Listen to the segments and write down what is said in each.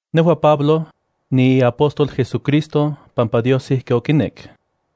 Nejua, Pablo, niiapóstol JesuCristo pampa Dios ijki okinek.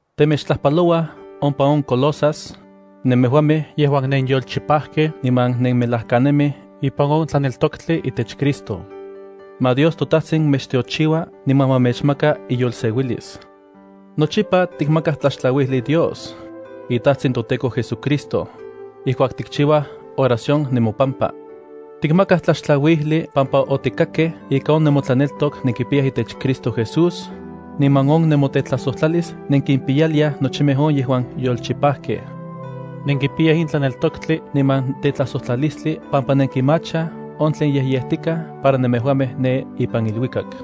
temechtlajpalouaj ompa on Colosas nemejuamej yejuan nenyolchipajkej niman nenmelajkanemij ipan on tlaneltoktli itech Cristo. Ma Dios toTajtsin mechtiochiua niman ma mechmaka iyolseuilis. Nochipa tikmakaj tlaxtlauijli Dios, iTajtsin toTEKO JesuCristo, ijkuak tikchiuaj oración nemopampa. Tikmakaj tlaxtlauijli pampa otikakkej ika on nemotlaneltok nenkipiyaj itech Cristo Jesús, niman on nemotetlajsojtlalis nenkimpiyaliaj nochimej on yejuan yolchipajkej. Nenkipiyaj in tlaneltoktli niman tetlajsojtlalistli pampa nenkimachaj on tlen yejyejtikaj para nemejuamej ne ipan iluikak.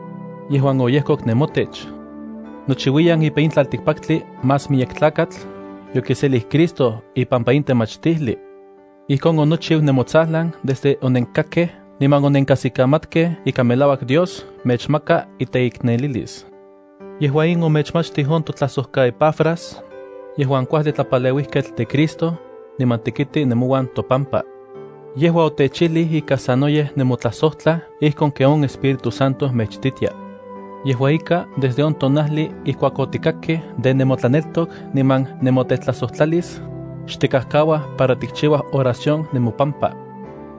yejuan oyejkok nemotech. Nochiuiyan ipan in tlaltikpaktli más miyek tlakatl yokiselij Cristo ipampa in temachtijli. Ijkon onochiu nemotsajlan desde onenkakkej niman onenkajsikamatkej ika melauak Dios mechmaka iteiknelilis. Yejua in omechmachtij on totlajsojkaEpafras yejuan kuajli tlapaleuijketl de Cristo, niman tekiti nemouan topampa. Yejua otechijlij ika sanoyej nemotlajsojtlaj ijkon ken on Espíritu Santo mechititia. Yejua ika, desde on tonajli ijkuak otikakkej de nemotlaneltok niman nemotlajsojtlalis, xtikajkauaj para tikchiuaj oración nemopampa.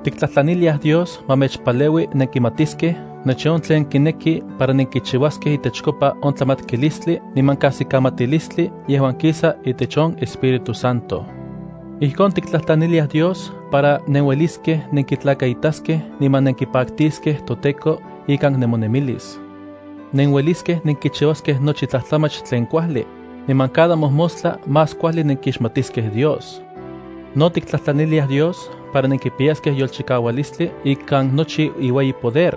Tiktlajtlaniliaj Dios ma mechpaleui nenkimatiskej nochi on tlen kineki para nenkichiuaskej itechkopa on tlamatkilistli niman kajsikamatilistli yejuan kisa itech on Espíritu Santo. Ijkon tiktlajtlaniliaj Dios para nenueliskej nenkitlakaitaskej niman nenkipaktiskej toTEKO ikan nemonemilis. Nenueliskej nenkichiuaskej nochi tlajtlamach tlen kuajli, niman cada mojmostla más kuajli nenkixmatiskej Dios. No tiktlajtlaniliaj Dios para nenkipiyaskej yolchikaualistli ikan nochi iueyi poder,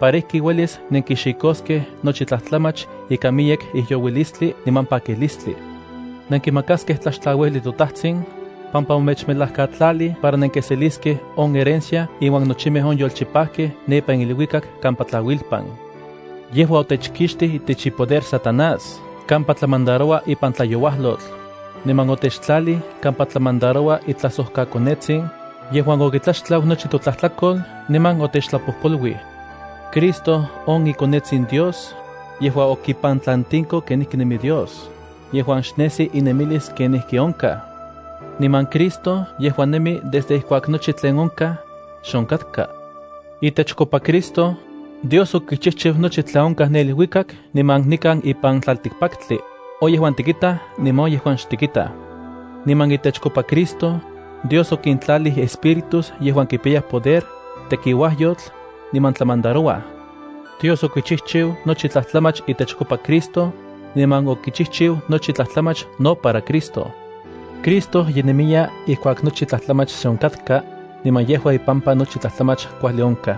para ijki uelis nenkixikoskej nochi tlajtlamach ikan miyek ijyouilistli niman pakilistli. Nenkimakaskej tlaxtlauijli toTajtsin, pampa omechmelajkatlalij para nenkiseliskej on herencia inuan nochimej on yolchipajkej ne ipan iluikak kampa tlauilpan. Yejua otechkixtij itech ipoder Satanás kampa tlamandaroua ipan tlayouajlotl, niman otechtlalij kampa tlamandaroua itlajsojkaKonetsin, yejuan okitlaxtlau nochi totlajtlakol, niman otechtlapojpoluij. Cristo on iKonetsin Dios, yejua okipantlantiko kenijki nemi Dios yejuan xnesi inemilis kenijki onkaj. Niman Cristo yejua nemi desde ijkuak nochi tlen onkaj, xe onkatka. Itechkopa Cristo, Dios okichijchiu nochi tlen onkaj ne iluikak niman nikan ipan tlaltikpaktli, on yejuan tikitaj niman on yejuan xtikitaj. Niman itechkopa Cristo, Dios okintlalij espíritus yejuan kipiyaj poder, tekiuajyotl, niman tlamandarouaj. Dios okichijchiu nochi tlajtlamach itechkopa Cristo, niman okichijchiu nochi tlajtlamach no para Cristo. Cristo ye nemiya ijkuak nochi tlajtlamach xe onkatka, niman yejua ipampa nochi tlajtlamach kuajli onkaj.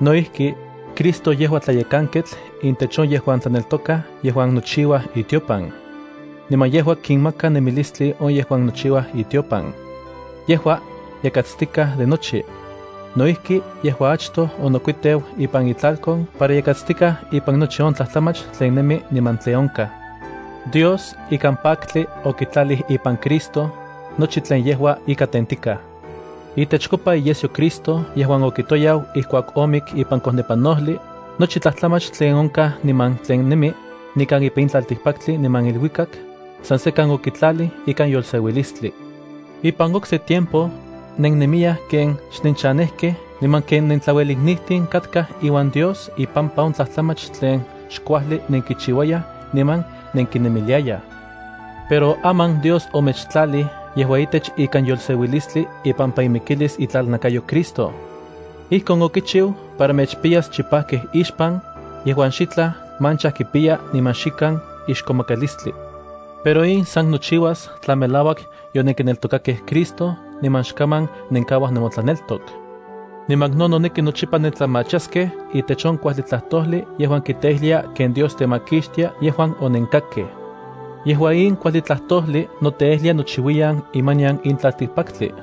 No ijki, Cristo yejua tlayekanketl intech on yejuan tlaneltokaj yejuan nochiuaj itiopan. Niman yejua kinmaka nemilistli on yejuan nochiuaj itiopan. Yejua, yakatstikaj de nochi. No ijki yejua achtoj onokuiteu ipan itlalkon para yakatstikaj ipan nochi tlajtlamach tlen nemi niman tlen onkaj. Dios ikan paktli okitlalij ipan Cristo, nochi tlen yejua ika tentikaj. Itechkopa iyesyo Cristo yejuan okitoyau ijkuak omik ipan kojnepanojli, nochi tlajtlamach tlen onkaj niman tlen nemi, nikan ipan in tlaltikpaktli niman iluikak, san sekan okitlalij ikan yolseuilistli. Ipan okse tiempo, nennemiyaj ken xnenchanejkej niman ken nentlaueliknijtin katkaj iuan Dios ipampa on tlajtlamach tlen xkuajli nenkichiuayaj niman nenkinemiliayaj. Pero aman Dios omechtlalij yejua itech ikan yolseuilistli ipampa imikilis itlalnakayo Cristo. Ijkon okichiu para mechpiyas chipajkej ixpan, yejuan xitlaj mancha kipiyaj niman xikan ixkomakalistli. Pero in san nochiuas tla melauak yonenkineltokakej Cristo niman xkaman nenkauaj nemotlaneltok. Niman no noneki nochipa nentlamachaskej itech on kuajli tlajtojli yejuan kiteijlia ken Dios temakixtia yejuan onenkakkej. Yejua in kuajli tlajtojli noteijlia nochiuiyan imanian in tlaltikpaktli.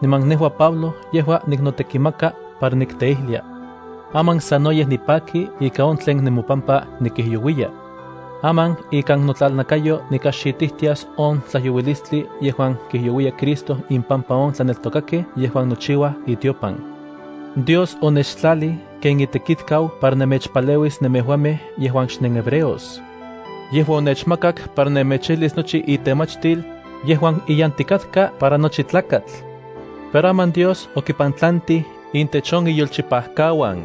Niman nejua Pablo yejua niknotekimaka para nikteijlia. Aman sanoyej nipaki ika on tlen nemopampa nikijyouiya. Aman ikan notlalnakayo nikajxitijtias on tlajyouilistli yejuan kijyouiya Cristo impampa on tlaneltokakej yejuan nochiuaj itiopan. Dios onechtlalij ken itekitkau para nemechpaleuis nemejuamej yejuan xnenhebreos. Yejua onechmakak para nemechijlis nochi itemachtil, yejuan iyantikatka para nochi tlakatl. Pero aman Dios okipantlantij intech on iyolchipakauan.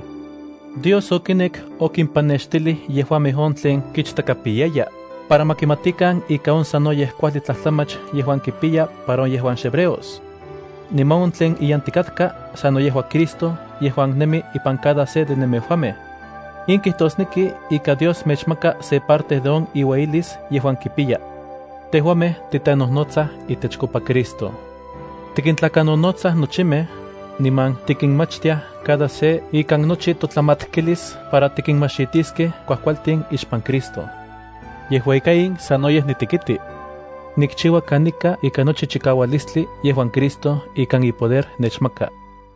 Dios okinek okimpanextijlij yejuamej on tlen kichtakapiyaya, para ma kimatikan ika on sanoyej kuajli tlajtlamach yejuan kipiya para on yejuan xhebreos. Niman on tlen iyantikatka sano yejua Cristo yejuan nemi ipan cada se de nemejuamej. In kijtosneki ika Dios mechmaka se parte de on iuelis yejuan kipiya. Tejuamej titenojnotsaj itechkopa Cristo. Tikintlakanonotsaj nochimej, niman tikinmachtiaj cada se ikan nochi totlamatkilis para tikinmajxitiskej kuajkualtin ixpan Cristo. Yejua ika in sanoyej nitekiti. Nikchiua kanika ika nochi chikaualistli yejuan Cristo ikan ipoder nechmaka.